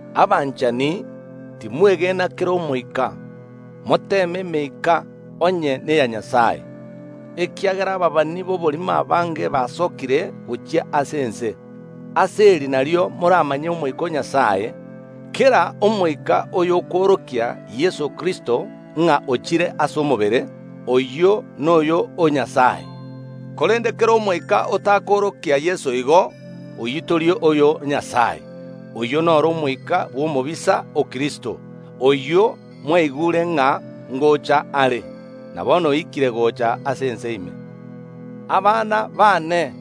Abanchani, timwegena kera omoika, moteeme emeika onye neya Nyasae, ekiagera ababani b’oborimo abange basokire gochia ase ense. Ase eri nario moramanye Omoika o Nyasae: Kera omoika oyokoorokia Yeso Kristo, ng’a ochire ase omobere, oyio noyo o Nyasae, korende kera omoika otakoorokia Yeso igo, oyio tori oyo o Nyasae. Oyio noro omoika bw’omobisa o Kristo; oyio mwaigure ng’a ngocha are, na bono oikire gocha ase ense ime. Abana baane,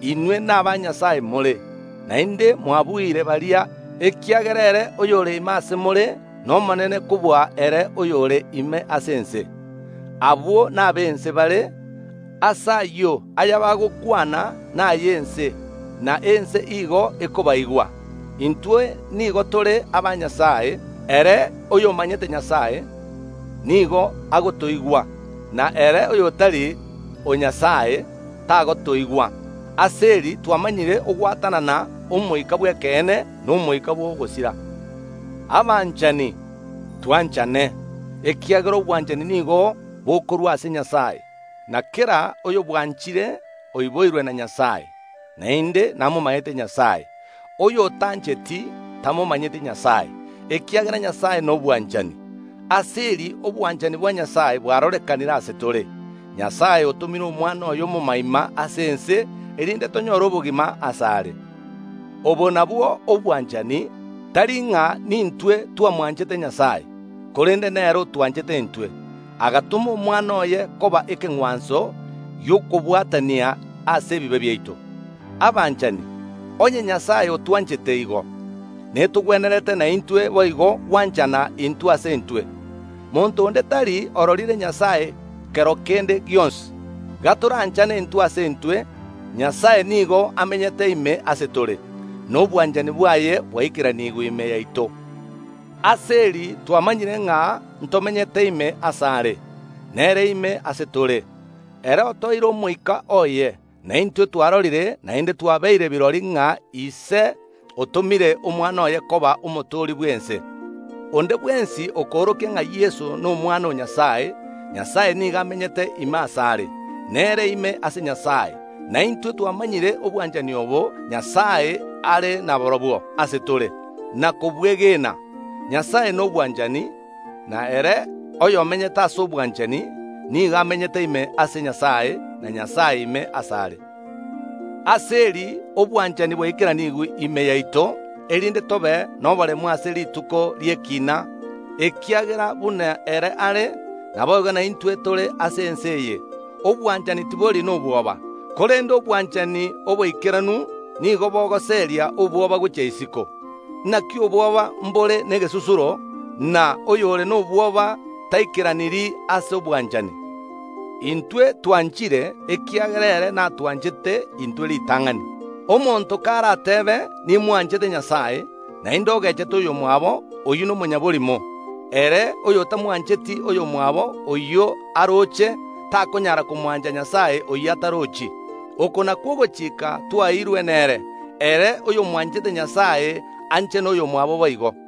inwe naba Nyasae more, naende mwabuire baria, ekiagera ere oyore ime ase more nomonene kobua ere oyore ime ase ense. Abwo nab’ense bare. Ase ayio, ayabagokwana nay’ense, na ense igo ekobaigwa. Intwe nigo tore aba Nyasae. Ere oyomanyete Nyasae nigo agotoigwa, na ere oyotari o Nyasae tagotoigwa. Ase eri twamanyire gwatanana Omoika bw’ekeene, na omoika bw’ogosira. Abanchani, twanchane, ekiagera obwanchani nigo bokorwa ase Nyasae, na kera oyobwanchire oiboirwe na Nyasae, naende namomanyete Nyasae. Oyotancheti, tamomanyeti Nyasae, ekiagera Nyasae nobwanchani. Ase eri obwanchani bwa Nyasae bwarorekanire ase tore: Nyasae otomire Omwana oye omomoima ase ense, erinde tonyore obogima asare. Obo nabwo obwanchani, tari ng’a nintwe twamwanchete Nyasae, korende nere otwanchete intwe, agatoma Omwana oye koba ekeng’wanso gi’okobwatania ase ebibe biaito. Abanchani, onye Nyasae otwanchete igo, netogwenerete naintwe boigo gwanchana intwe ase intwe. Monto onde tari ororire Nyasae kero kende gionsi. Gatoranchane intwe ase intwe, Nyasae nigo amenyete ime ase tore, na obwanchani bwaye bwaikeranigwe ime yaito. Ase eri twamanyire ng’a ntomenyete ime asare, nere ime ase tore: Ere otoeire Omoika oye. Na intwe twarorire, naende twabeire birori ng’a Ise otomire Omwana oye koba Omotooria bw’ense. Onde bwensi okoorokia ng’a Yeso n’Omwana o Nyasae, Nyasae nigo amenyete ime asare, na ere ime ase Nyasae. Na intwe twamanyire obwanchani obo Nyasae are naborobwo ase tore, na kobwegena. Nyasae nobwanchani, na ere oyomenyete ase obwanchani nigo amenyete ime ase Nyasae, na Nyasae ime asare. Ase eri obwanchani bwaikeranigwe ime yaito, erinde tobe noboremu ase rituko ri’ekiina, ekiagera buna ere are, naboigo naintwe tore ase ense eye. Obwanchani tibori nobwoba, korende obwanchani oboikeranu nigo bogoseria obwoba gochia isiko. Naki obwoba mbore negesusuro, na oyore nobwoba taikeraniri ase obwanchani. Intwe twanchire, ekiagera ere natwanchete intwe ritang’ani. Omonto karatebe, “Nimwanchete Nyasae,” naende ogechete oyomwabo, oyio nomonyaborimo. Ere oyotamwancheti oyomwabo oyio aroche, takonyara komwancha Nyasae oyio atarochi. Oko nakwo ogochika twaeirwe nere: Ere oyomwanchete Nyasae anche noyomwabo boigo.